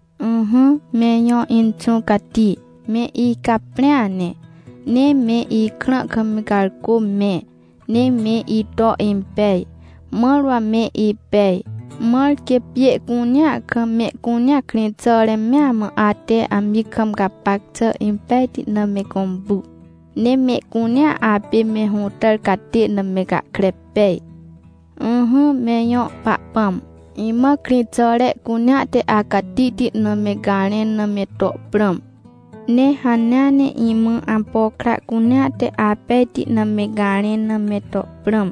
Ỹhỹ, me ijõ Inxũ Cati, me icaprĩa ne, ne me ikrã kam garcô mẽ, ne me ito impej, mãr wa me ipej. Mãr quê pjê cunea kam, mehcunea, krĩxàre mea mã, ate amji kam gapac xà impejti na me gõmpu, ne mehcunea apê me hũtàr catê na me gahkre pej. Ỹhỹ, me ijõ Pahpãm, imã krĩxàre cunea te acatihti na me garẽn na me to prãm. Ne hanea ne imã ampo kra cunea te apejti na me garẽn na me to prãm.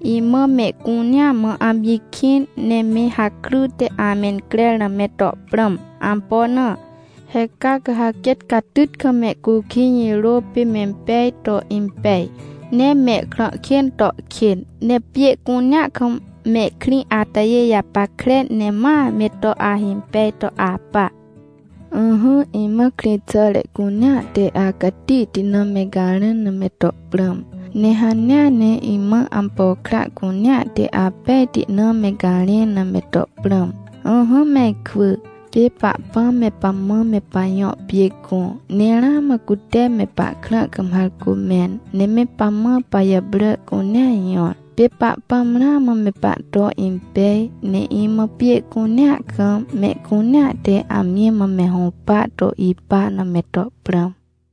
Imã mehcunea mã amji kĩn, ne me hakryte amencrer na me to prãm. Ampo na? He caa ca ha quêt catyt kam mehcukij jirô pê mempej to impej, ne mehkrã kên to kên, ne pjê cunea kam mehkrĩ atajê japackre ne ma me to ahimpej to apa. Ỹhỹ, imã krĩxàre cunea te acatihti na me garẽn na me to prãm. Ne hanea ne imã ampo kra cunea te apejti na me garẽn na me to prãm. Ỹhỹ me ikwỳ, pê Pahpãm me pamã me pajõ pjê gõ. Ne ramã cute me pahkrã kam harcô mẽn, ne me pamã pajàprà cunea jõr. Pê Pahpãm ramã me pahto impej. Ne imã pjê cunea kam, mehcunea te amji mã me hũpa to ipa na me to prãm!